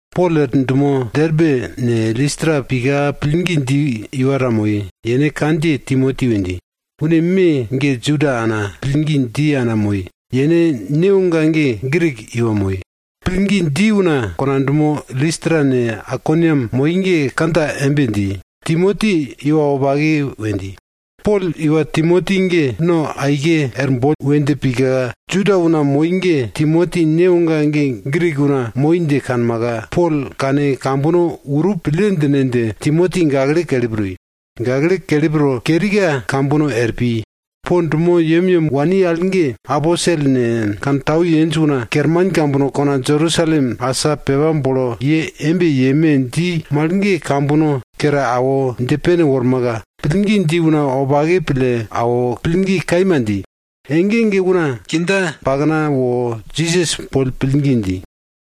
Pol er dumo Derbe ne, Listra pika pillgi dji iwa ta moi, yene kandjiye Timoti we dji. Une me ge Juda ana pillgi dji ana moi, yene newoga ge Grik iwa moi. Pillgi dji una kona dumo Listra ne, Aikoniam moi ge kandja embe dji, Timoti iwa wopake we dji. Pol iwa Timoti ge no aike er bon we dje pika, Juda una moi ge Timoti newoga ge Grik una moi dje kanmaka, Pol kane kambono urup pille djine dje, Timoti gakle kelip toi. Gakle kelip to kerika kambono er pi. Po dumo yemyem wani al ge aposel ne, kantau yenj una kerman kambono kona Jerusalem asa pepa bolo ye embe yeme dji mal ge kambono kere awo dje pene wormaka, pillgi dji una wopake pille awo, pillgi kaima dji. Ege ege una kindja pakna wo Jisas boll pillgi dji.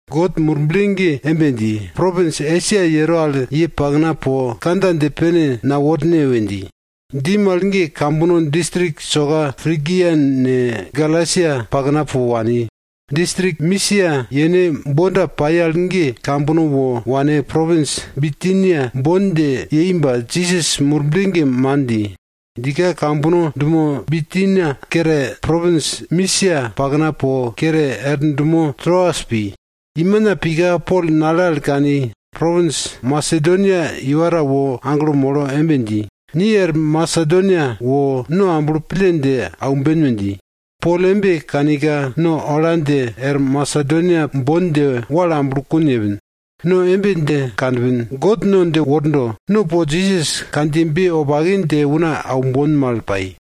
God Murble ge embe dji, propins Esia yero al ye pakna po kandja dje pene naworne we dji. Dji mal ge kambono distrik soka Prigia ne, Galasia pakna po wani. Distrik Misia yene bonda pai al ge kambono wo wane propins Bitinia bon dje yei ba, Jisas Murble ge man dji. Djika kambono dumo Bitinia kere, propins Misia pakna po kere er dumo Troas pi. Imina pika Pol nale al kani, propins Masedonia iwa ta wo aglo molo embe dji, ni er Masedonia wo, no amblo pille dje aumben we dji. Pol embe kanika, no ola dje er Masedonia bon dje wal amblokun yepin. No embe dje kanpin, God no dje wordo, no po Jisas kandjiyebe wopake dje una aumbon mal pai.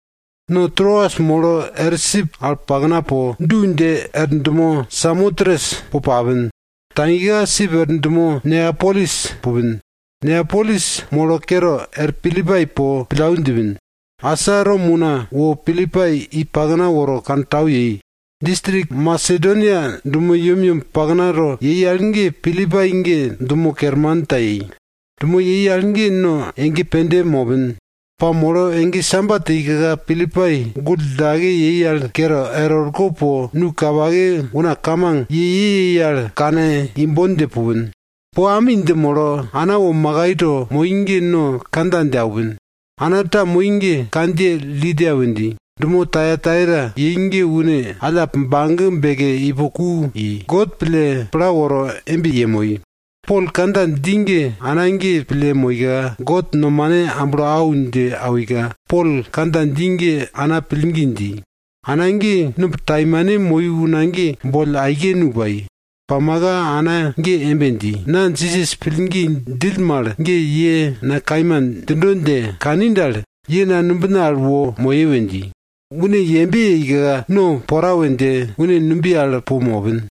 No Troas molo er sip al pakna po, du dje er dumo Samotres po papin. Tagika sip i er dumo Neapolis pupin. Neapolis molo kere er Pilipai po pillau djipin. Asa Rom una wo Pilipai i pakna woro kantau yei. Distrik Masedonia dumo yemyem paknato yei al ge Pilipai ge dumo kerman ta yei. Dumo yei al ge no ege pende mopin. Pa molo ege Sabat yeika, Pilipai gull djillake yei al kere er orko po nu kapake una kamang ye ye yei al kane imbon dje pupin. Po ami dje molo, ana wo makai to moi ge no kandja dje aupin. Ana ta moi ge kandjiye Lidia we dji. Dumo Tayataira yei ge une allap bage beke ipo ku i, God pille pla ye awo embe yemoi. Pol kandja dji ge ana ge pille moika, God nomane amblo au dje awika, Pol kandja dji ge ana pillgi dji. Ana ge numb taimane moi una ge, boll aike nu pai. Pamaka ana ge embe dji, na Jisas pillgi djill mal ge ye na kaima djindo dje kani dal, ye na numbina al wo moye we dji. Une yembe yeika, no pora we dje, une numbiye al po mopin.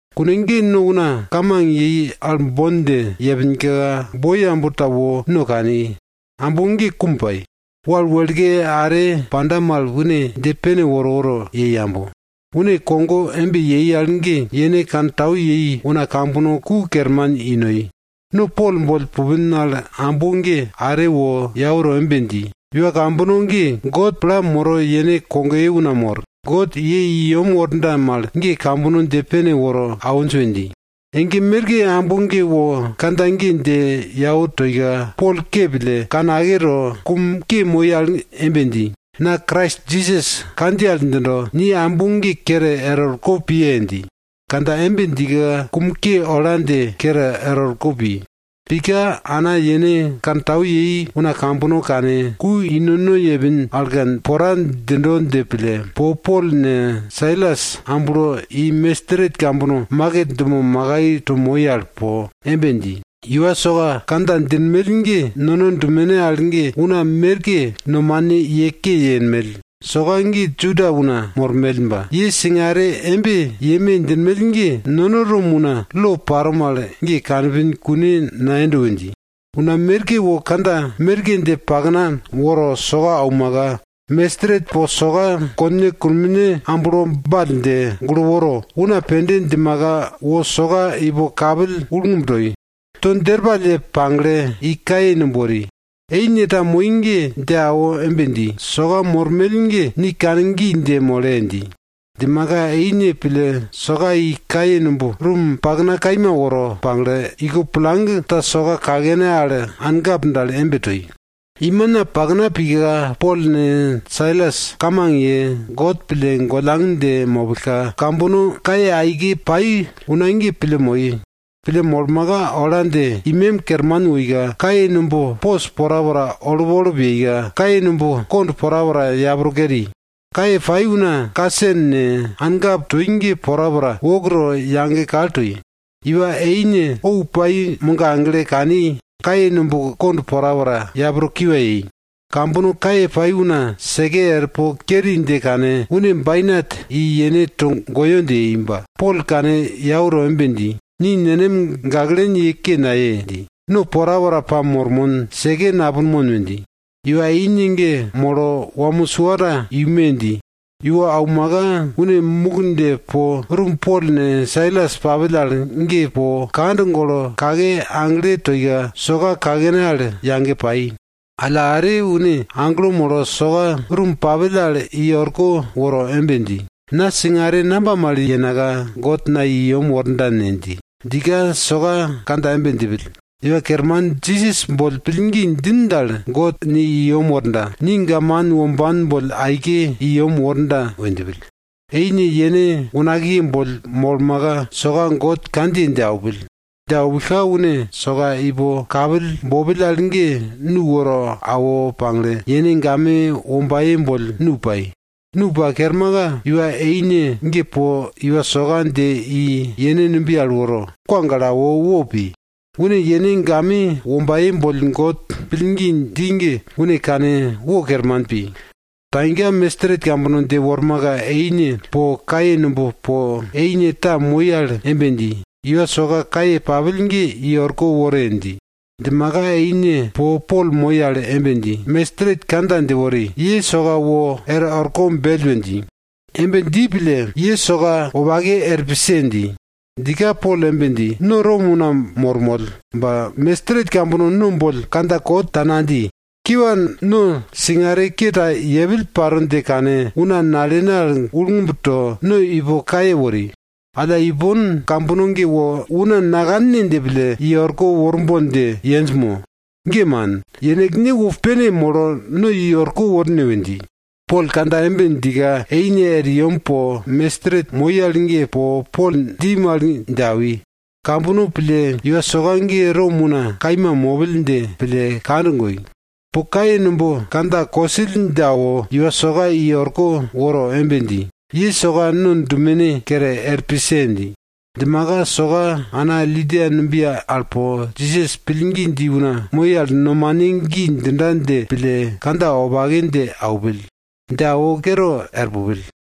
Kune ge no una kamang yei al bon dje yepinka, boi ambo ta wo no kani. Ambo ge kum pai. Wal wekle are panda mal une dje pene woro woro yei ambo. Une kogo embe yei al ge yene kantau yei una kambono ku kerman i noi. No Pol boll pupin al ambo ge are wo yau to embe dji, iwa kambono ge, God pla moro yene boiye una mor. God ye i yem worda mal ge kambono dje pene woro awinj we dji. Ege merke ambo ge wo kandja ge dje yau toika, Pol ke pille, kane ake to, kum ke moi al embe dji, na Krais Jisas kandjiye al djindo, ni ambo ge kere er orko piye dji. Kandja embe djika, kum ke ola dje kere er orko pi. Pika ana yene kantau yei una kambono kane, ku i nono yepin al ge, pora djindo dje pille, po Pol ne, Sailas amblo i mestret kambono maket dumo makai to moi al po embe dji, iwa soka kandja djinmell ge nono dumene al ge una merke nomane ye ke yenmell. Soka ge Juda una mormell ba, ye singare embe yeme djinmell ge, nono Rom una lo paro mal ge kanpin kune nayendo we dji. Una merke wo kandja merke dje pakna woro soka aumaka, mestret po soka konne kunomne amblo ball dje, gulo woro, una pende djimaka, wo soka ipo kapill ullngub toi. To djerpall ye pagle, i kaye numb wori, eine ta moi ge dje awo embe dji, soka mormell ge ni kane gi dje mole! dji. Djimaka eine pille soka i kaye numb rum pakna kaima woro pagle, iko plang ta soka kakene al ankap dal embe toi. Imina pakna pika, Pol ne, Sailas kamang ye, God pille gollang dje mopillka, kambono kaye aike pai una ge pille moi. Pille molmaka, ola dje imem kerman woika, kaye numb pos porapora olup olup yeika, kaye numb kond porapora yapro keri. Kaye pai una kasen ne, ankap toi ge porapora wok to yage kal toi. Iwa eine ou pai mogagle kani, kaye numb kond porapora yapro kiwa yei. Kambono kaye pai una seke er po keri dje kane, une bainat i yene togoyo dje yei. Ba Pol kane yau to embe dji, ni nenem gaklen ye ke naye! dji. No porapora pamormon, seke napunmon we dji. Iwa eine ge molo, wamo sua ta iume! dji. Iwo aumaka, une muk dje po rum Pol ne, Sailas papill al ge po kand golo kake agle toika, soka kakene al yage pai. Alla are une aglo molo soka rum papill al i orko woro embe dji, na singare namba mal yenaka, God na i yem worda ne? dji. Djika soka kandja embe djipill, Iwa Kerman Jisas boll pillgi djin dal, God ni i yem worda. Ni gaman womban boll aike i yem worda we djipill. Eine yene unakiye boll molmaka soka God kandjiye dje aupill. Dje aupillka une soka ipo kapill bopill al ge nu woro awo pagle, yene game wombaye boll nu pai. Nu pa kermaka, iwa eine ge po iwa soka dje i yene numbiye al woro, kwa gale awo wo pi. Une yene game wombaye boll God pillgi dji ge une kane wo kerman pi. Tagika, mestret kambono dje wormaka eine po kaye numb po eine ta moi al embe dji, iwa soka kaye papill ge i orko wore! dji. Djimaka eine po Pol moi al embe dji, mestret kandja dje wori. Ye soka wor orko bell we dji. Embe dji pille ye soka ellne tukne arngan yenda er pise! dji. Djika Pol embe dji, no Rom una mormoll ba, mestret kambono no boll kandja kot ta nadji. Kiwa, no singare ke ta yepill paro dje kane, una nalene al ullngub to, no ipo kaye wori. Alla ipon kambono ge wo una nakanne dje pille, i orko worbon dje yenj mo? Ge man! Yenekne wo pene molo no i orko worne we dji. Pol kandja embe djika eine er yem po mestret moi al ge po Pol dji mal dje awi. Kambono pille iwa soka ge Rom una kaima mopill dje pille kand goi. Po kaye numb kandja kosill dje awo, iwa soka i orko woro embe dji, ye soka no dumene kere er pise! dji. Djimaka soka ana Lidia numbiye al po, Jisas pillgi dji una moi al nomane gi djinda dje pille kandja wopake dje aupill. Dje awo kere er pupill.